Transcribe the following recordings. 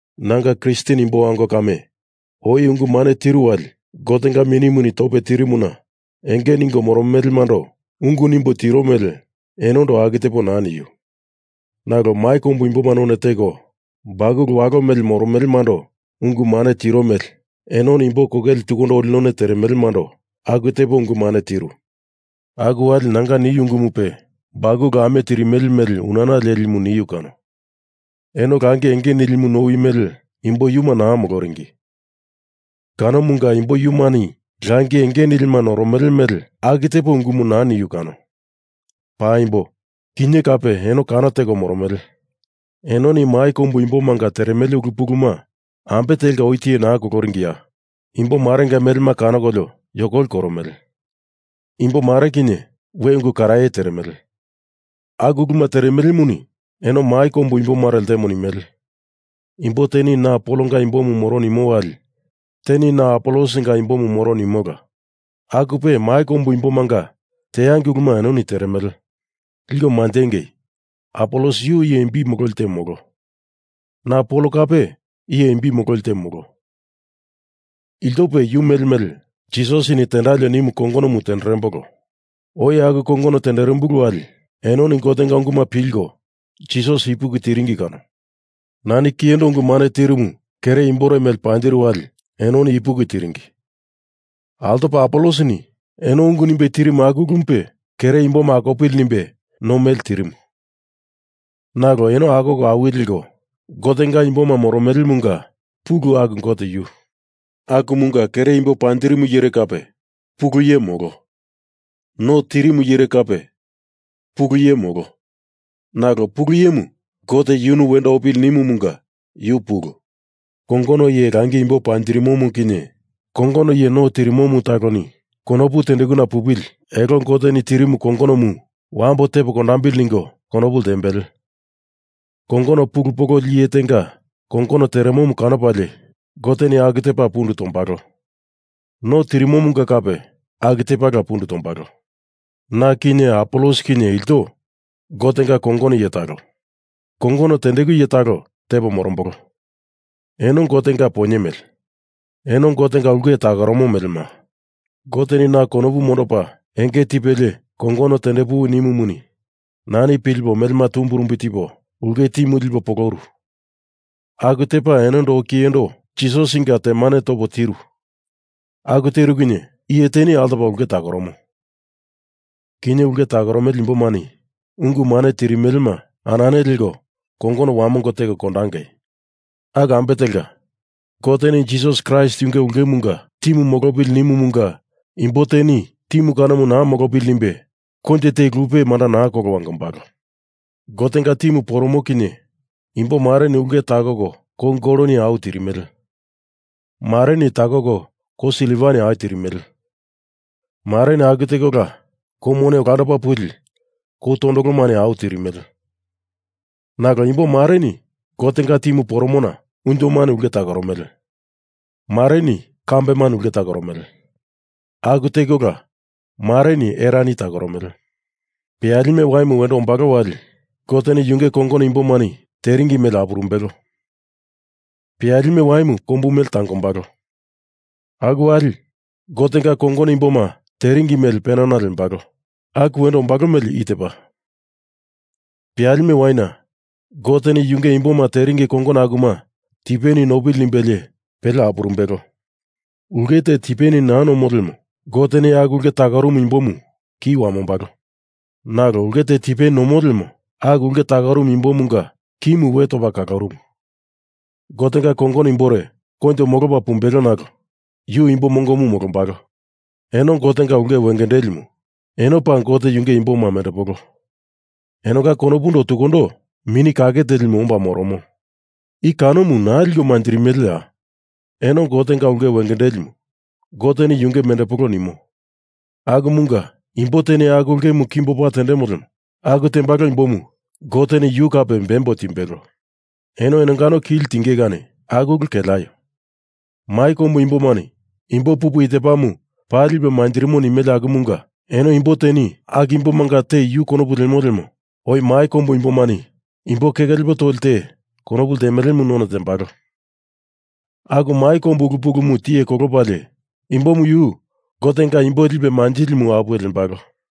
Nanga Kristen imbo ango kame, oi ungu mane tiru wali Gotenga Minimuni tope tirimuna enge ningo moromelemando ungu nimbo tiro mele enondo aku tepo naa niu. Nalo mai kombu imboma none teko bakulu walo mele moromelemando ungu mane tiro mele enoni imbo kokele tukundo oli none teremelemando aku tepo ungu mane tiru. Aku wali nanga niu ungumupe bakulu ame tirimele mele unana lelimu niu kano. Eno langi enge nilimu nowi mele imbo yuma naa moloringi kanomunga imbo yumani langi enge nilima noromele mele aku tepo ungumu naa niu kano. Paimbo, kinye kape eno kano teko moromele. Enoni mai kombu imbomanga teremele ulu puluma ambe telka oi tiye naa koloringiya? Imbo marenga melema kanokolio yokoli koromele. Imbo mare kinye, we ungu karaye teremele. Aku uluma teremelemuni eno mai kombu imbomare ltemo nimele. Imbo teni na Polonga imbomu moro nimo wali teni na Apolosinga imbomu moro nimola, akupe mai kombu imbomanga teangei uluma enoni teremele. Liko manjengei, Apolos yu iye imbi mololi te molo. Na Pol kape iye imbi mololi te molo. Iltope yu mele mele Jisasini tendalio nimu kongonomu tenderembolo. Oi aku kongono tenderimbulu wali enoni Gotenga unguma pilko Jisas ipuki tiringi kano. Nani kiyendo ungu mane tirumu, kere imbore mele panjiru wali enoni ipuki tiringi. Altopa Apolosini eno ungu nimbe tirimu aku ulumupe kere imboma akopili nimbe no mele tirimu. Nalo eno akoko awili leko Gotenga imboma moromelemunga pulu aku Gote yu. Akumunga iye kere imbo panjirimure kape, pulu iye molo. No tirimu iyere kape, pulu iye molo. Nalo Pulu Iyemu Gote yunu wendo opili nimumunga, yu pulu. Kongono iye langi imbo panjirimomu kinye kongono iye no tirimomu taloni konopu tendekuna pupili elo Goteni tirimu kongonomu wambo tepo kondambili ningo konopu ltembele. Kongono pulu pololi iye tenga kongono teremomu kanopalie Goteni aku tepa pundu tombalo. No tirimumunga kape aku tepala pundu tombalo. Na kinye Apolos kinye ilto Gotenga kongono iye talo. Kongono tendeku iye talo tepo morombolo. Eno Gotenga poinye mele. Eno Gotenga ulke takoromo melema. Goteni na konopu mondopa enge tipelie kongono tendepuwi nimumuni nani pulipo melema tumbirumbi tipo ulke timu lipo poloru aku tepa enondo oi kiyendo Jisasinga temane topo tiru. Aku teru kinye iye teni altopa ulke takoromo. Kinye ulke takoromele imbomani ungu mane tirimelema anane leko kongono wamongo teko kondangei. Aku ambe telka, Goteni Jisas Kraist yunge ulkemunga timu molopili nimumunga imbo teni timu kanomu naa molopili nimbe koinjo te lupe manda naa kolo wangombalo. Gotenga timu poromo kinye imbomareni ulke takoko kou goloni au tirimele. Mareni takoko kou silvani au tirimele. Mareni aku tekola kou mone olando puli kou tondolomani au tirimele. Nalo imbo mareni Gotenga timu poromona unjomani ulke takoromele. Mareni kambeni ulke takoromele. Aku tekola mareni erani takoromele. Peyalime waimu wendo ombalo wali Goteni yunge kongono imbomani teringi mele apurumbelo. Peyalime waimu kombu mele tangombalo. Aku wali Gotenga kongono imboma teringi mele penana lembalo. Aku wendo ombalo mele i tepa, peyalime waina Goteni yunge imboma teringi kongono akuma tipeni nopili nimbelie, pele apurumbelo. Ulke te tipeni naa nomo lemo Goteni aku ulke takorumu imbomu ki wamombalo. Nalo ulke te tipeni nomo lemo aku ulke takorumu imbomunga kimu we topa kalorumu. Gotenga kongono imbore koinjo molopa pumbelo nalo yu imbo mongomu molombalo. Eno Gotenga ulke wengendelimu. Eno paa Gote yunge imboma mendepolo. Enonga konopundo tukundo Mini Kake Telimu omba moromo. I kanomu naa liko manjirimeleya? Eno Gotenga ulke wengendelimu Goteni yunge mendepolo nimo. Akumunga imbo teni aku ulkemu tepa kimbo opa tendemo lemo aku tembalo imbomu Goteni yu kape bembo timbelo. Eno enongano kili tingei kani aku ulu keleaio. Mai kombu imbomani imbo pupu i tepamu paa lipe manjirimo nimele akumunga eno imbo teni aku imbomanga te yu konopu lemo lemo oi mai kombu imbomani imbo keke lepo toli te konopu ltemelemu none tembalo. Aku mai kombu ulu pulumu tiye kolopalie imbomu yu Gotenga imbo lipe manjilimu apuwe lembalo.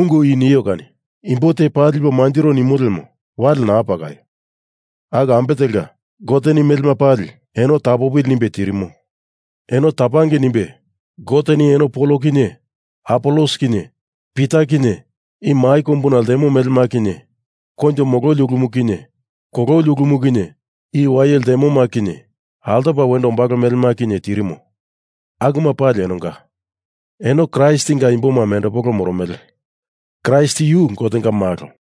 Ungu i nio kani imbo te paa lipo manjiro nimo lemo wale naa pakaio. Aku ambe telka, Goteni melema pali eno tapopili nimbe tirimo. Eno tapangei nimbe Goteni eno Pol kinye Apolos kinye Pita kinye i mai kombuna ltemo melema kinye koinjo mololi ulumu kinye kololi ulumu kinye i wai ltemoma kinye altopa wendo ombalo melema kinye tirimo. Akuma pali enonga. Eno Kraistinga imboma mendepolo moromele. Kraist yu Gotenga malo.